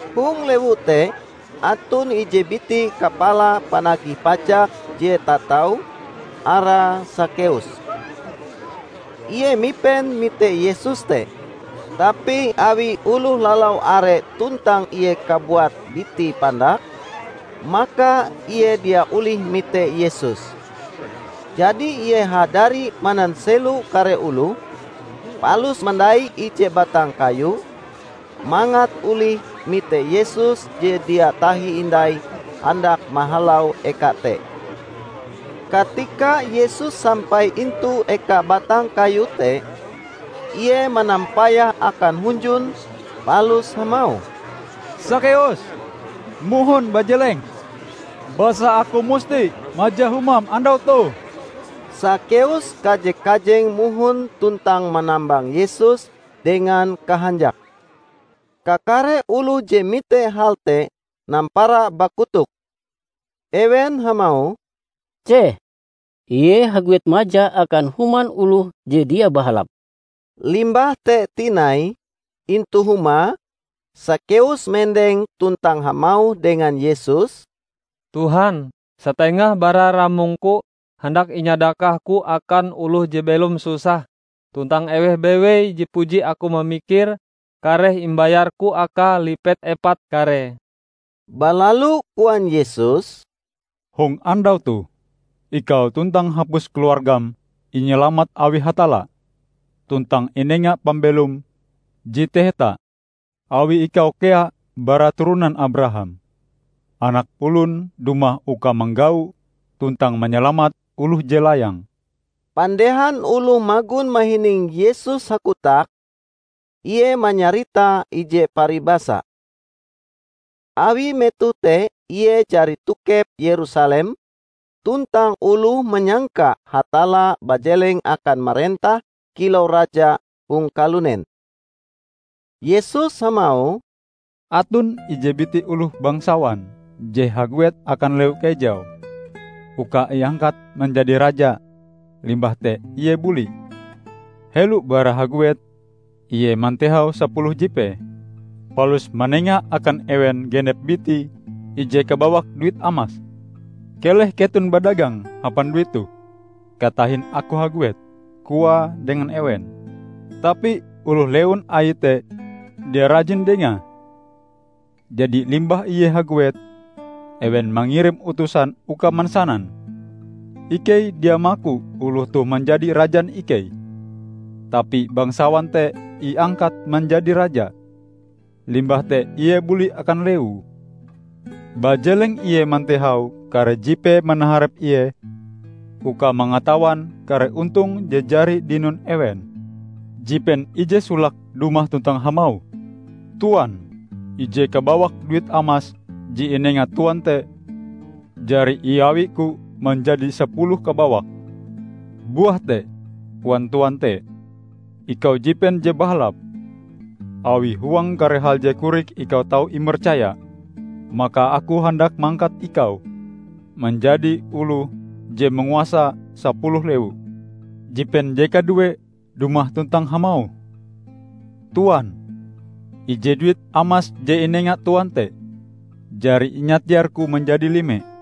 Hong lewu te aton ije biti kapala panagih pajak je tatau, arae Sakeus. Ie mipen mite Yesus te, tapi awi oloh lalau are tuntang ie kabuat bitie pandak, maka ie dia olih mite Yesus. Jadi, ie hadari mananselo kare oloh, palus mandai ije batang kayu, mangat olih mite Yesus je dia tahi hindai handak mahalau eka te. Katika Yesus sampai intu eka batang kayu te, ie manampayah akan hunjun palus hamauh, "Sakeus, mohon bajeleng! Basa aku musti maja humam andau toh." Sakeus kaje-kajeng mohon tuntang manambang Yesus dengan kahanjake. Kakare oloh je mite hal te nampara bakotok. Ewen hamauh, "Ceh! Ie haguet maja akan human oloh je dia bahalap!" Limbah te tinai, intu humae, Sakeus mendeng tuntang hamauh dengan Yesus, "Tuhan, satengah bara ramongku handak inyadakahku akan oloh je belom susah; tuntang eweh bewei je puji aku mamikire kareh imbayarku akae lipet epat karee!" Balalu koan Yesus, "Hong andau toh, ikau tuntang hapus keluargam inyalamat awi Hatalla tuntang inenga pambelom je taheta awi ikau kea bara turonan Abraham. Anak Olon dumah uka manggau tuntang manyalamat oloh je layang." Pandehan oloh magon mahining Yesus hakotak, Ie manyarita ije paribasa. Awi metoh te Ie jari tokep Yerusalem, tuntang oloh manyangka Hatalla bajeleng akan marentah kilau Raja hong kalunen. Yesus hamauh, "Aton ije biti oloh bangsawan je haguet akan lewu kejau uka iangkat manjadi raja, limbah te ie buli. Helo bara haguet, ie mantehau sapuluh jipee, palus manenga akan ewen genep bitie ije kabawak duit amas. 'Keleh keton badagang hapan duit toh katahin aku haguet,' koae dengan ewen. Tapi oloh lewun aie te dia rajin dengae. Jadi, limbah ie haguet, ewen mangirim utusan uka mansanan, 'Ikei dia maku oloh toh manjadi rajan ikei.' Tapi bangsawan te iangkat manjadi raja, limbah te ie buli akan lewue. Bajeleng ie mantehau kare jipee manaharep ie, uka mangatawan kare ontong je jari dinon ewen. Jipen ije solake dumah tuntang hamauh, 'Tuan, ije kabawak duit amas je inenga tuan te, jari iawiku manjadi sapuluh kabawak.' 'Buah te,' koan tuan te, 'ikau jipen je bahalap! Awi huang kare hal je korik ikau tau imercaya, maka aku handak mangkat ikau manjadi oloh je manguasa sapuluh lewu.' Jipen je kaduee dumah tuntang hamauh, 'Tuan, ije duit amas je inenga tuan te, jari inyatiarku manjadi lime.'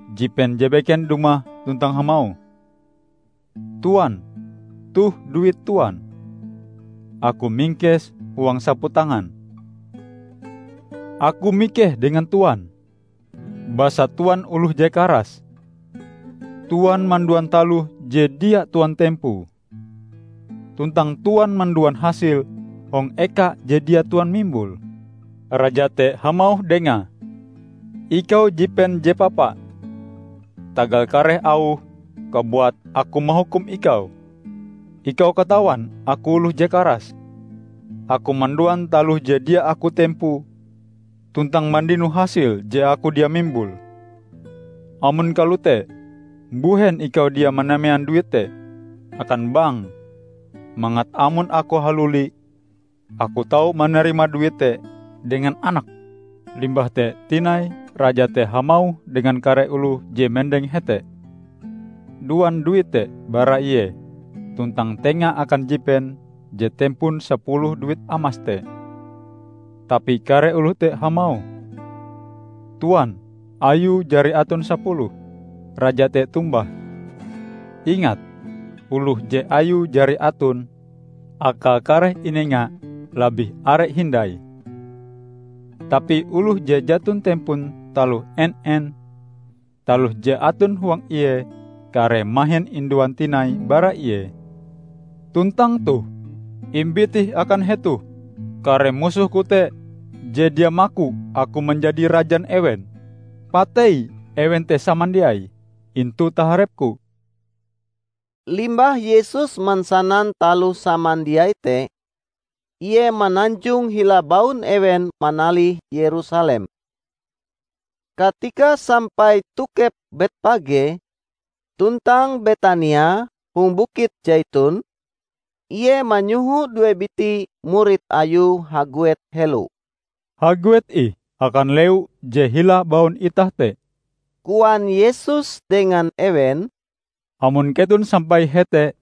Jipen je beken dumah tuntang hamauh, 'Tuan, toh duit tuan; aku mingkese huang saputangan. Aku mikeh dengan Tuan, basa Tuan oloh je karas. Tuan manduan taloh je dia Tuan tempoe, tuntang Tuan manduan hasil hong eka je dia Tuan mimbule.' Raja te hamauh dengae, 'Ikau jipen je papa! Tagal kare auhm kabuat aku mahukum ikau. Ikau katawan aku oloh je karas: aku manduan taloh je dia aku tempoe tuntang mandino hasil je aku dia mimbule. Amon kalote mbuhen ikau dia manamean duit te akan bank mangat amon aku haluli aku tau manarima duit te dengan anake?' Limbah te tinai raja te hamauh dengan kare oloh je mendeng hete, 'Duan duit te bara ie tuntang tenga akan jipen je tempon sapuluh duit amas te.' Tapi kare oloh te hamauh, 'Tuan, ayue jari aton sapuluh.' Raja te tombah, 'Ingat: oloh je ayue jari aton, akae kareh inenga labih are hindai. Tapi oloh je jaton tempon taloh en-en, taloh je aton huang ie kareh mahin induan tinai bara ie. Tuntang toh, imbit ih akan hetoh kare musohku te je dia maku aku manjadi rajan ewen. Patei ewen te samandiai intu taharepku!' " Limbah Yesus mansanan taloh samandiai te, Ie mananjong hila baun ewen manalih Yerusalem. Katika sampai tokep Betpage tuntang Betania hong Bukit Saiton, Ie manyoho due biti murid Ayue haguet helo. "Haguet ih akan lewu je hila baun itah te," koan Yesus dengan ewen, "amon keton sampai hete,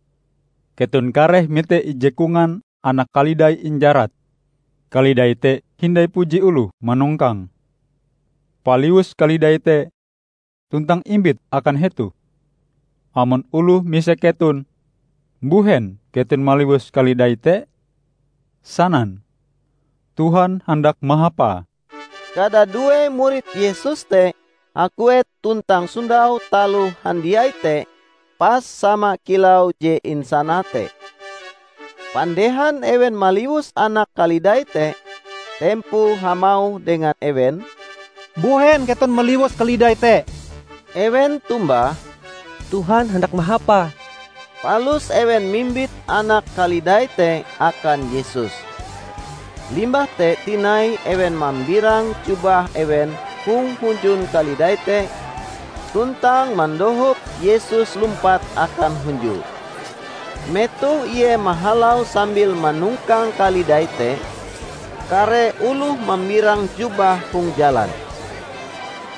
keton kareh mite ije kongan anak kalidai injarat. Kalidai te hindai puji oloh manongkange. Paliwus kalidai te tuntang imbit akan hetoh. Amon oloh misek keton, 'Mbuhen keton maliwus kalidai te?' sanan, 'Tuhan handak mahapae.' " Kadadue murid Yesus te haguet tuntang sondau taloh handiai te pas sama kilau je insanae te. Pandehan ewen maliwus anak kalidai te, tempoe hamauh dengan ewen, "Mbuhen keton maliwus kalidai te?" Ewen tombah, "Tuhan handak mahapae." Palus ewen mimbit anak kalidai te akan Yesus. Limbah te tinai ewen mambirang jubah ewen hong hunjun kalidai te tuntang mandohop Yesus lumpat akan hunjue. Metoh ie mahalau sambil manongkang kalidai te, kare oloh mambirang jubahe hong jalan.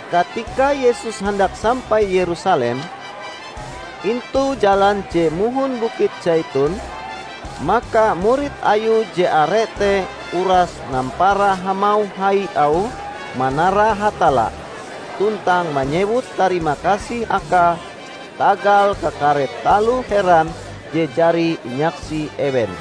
Katika Yesus handak sampai Yerusalem, intu jalan je mohon Bukit Saiton, maka murid Ayue je are te uras nampara hamauh hai auhe manara Hatalla tuntang manyewut tarimakasih Akae tagal kakare taloh heran je jari inyaksi ewen.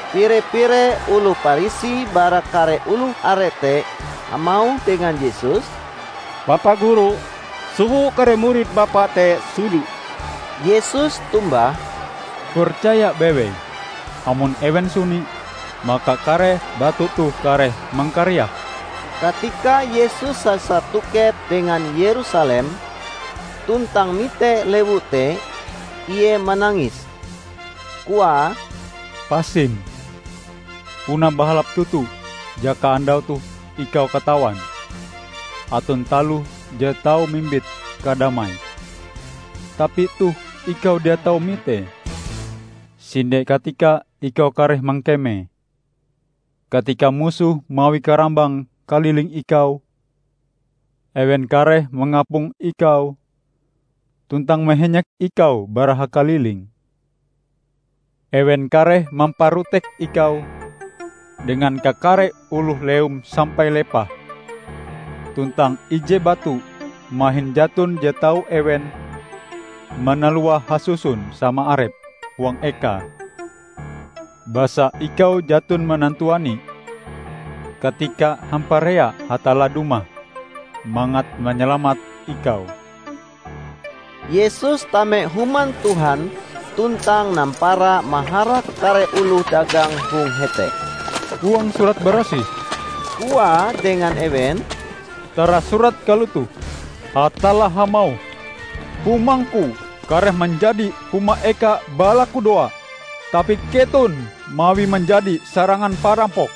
Pire-pire oloh Parisi bara kare oloh are te hamauh dengan Yesus, "Bapa Guru, soho kare murid Bapa te suni." Yesus tombah, "Percaya bewei! Amon ewen suni, maka kare batu toh kareh mangkariak." Katika Yesus sasar tokep dengan Yerusalem, tuntang mite lewu te, ie manangis. Koae, "Pasim, puna bahalap toto jaka andau toh ikau katawan aton taloh je tau mimbit kadamai! Tapi toh ikau dia tau mitee. Sinde katika ikau kareh mangkeme, katika musohm mawi karambang kaliling ikau; ewen kareh mangapong ikau tuntang mahenyek ikau bara hakaliling. Ewen kareh mamparotek ikau dengan kakare oloh lewum sampai lepah; tuntang ije batu mahin jaton je tau ewen manaluae hasusun sama arepe huang ekae, basa ikau jaton manantuani katikae hamparea Hatalla dumah mangat manyalamat ikau!" Yesus tame Human Tuhan tuntang nampara maharak kare oloh dagang hong hete. "Huang Surat Barasih," Koae dengan ewen, "tarasurat kalotoh: Hatalla hamauh, 'Humangku kareh manjadi huma eka balakudoa.' Tapi keton mawie manjadi sarangan parampok!"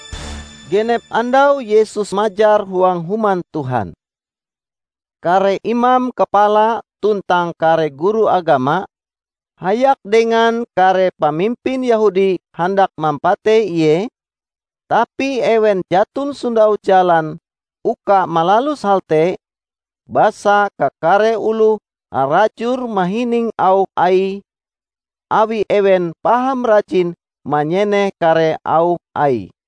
Genep andau Yesus majar huang Human Tuhan. Kare imam kapala tuntang kare guru agama, hayak dengan kare pamimpin Yehudi handak mampatei Ie, tapi ewen jaton sondau jalan uka malalus hal te, basa kakare oloh harajur mahining auh Aie, awi ewen paham rajin manyeneh kare auh Aie.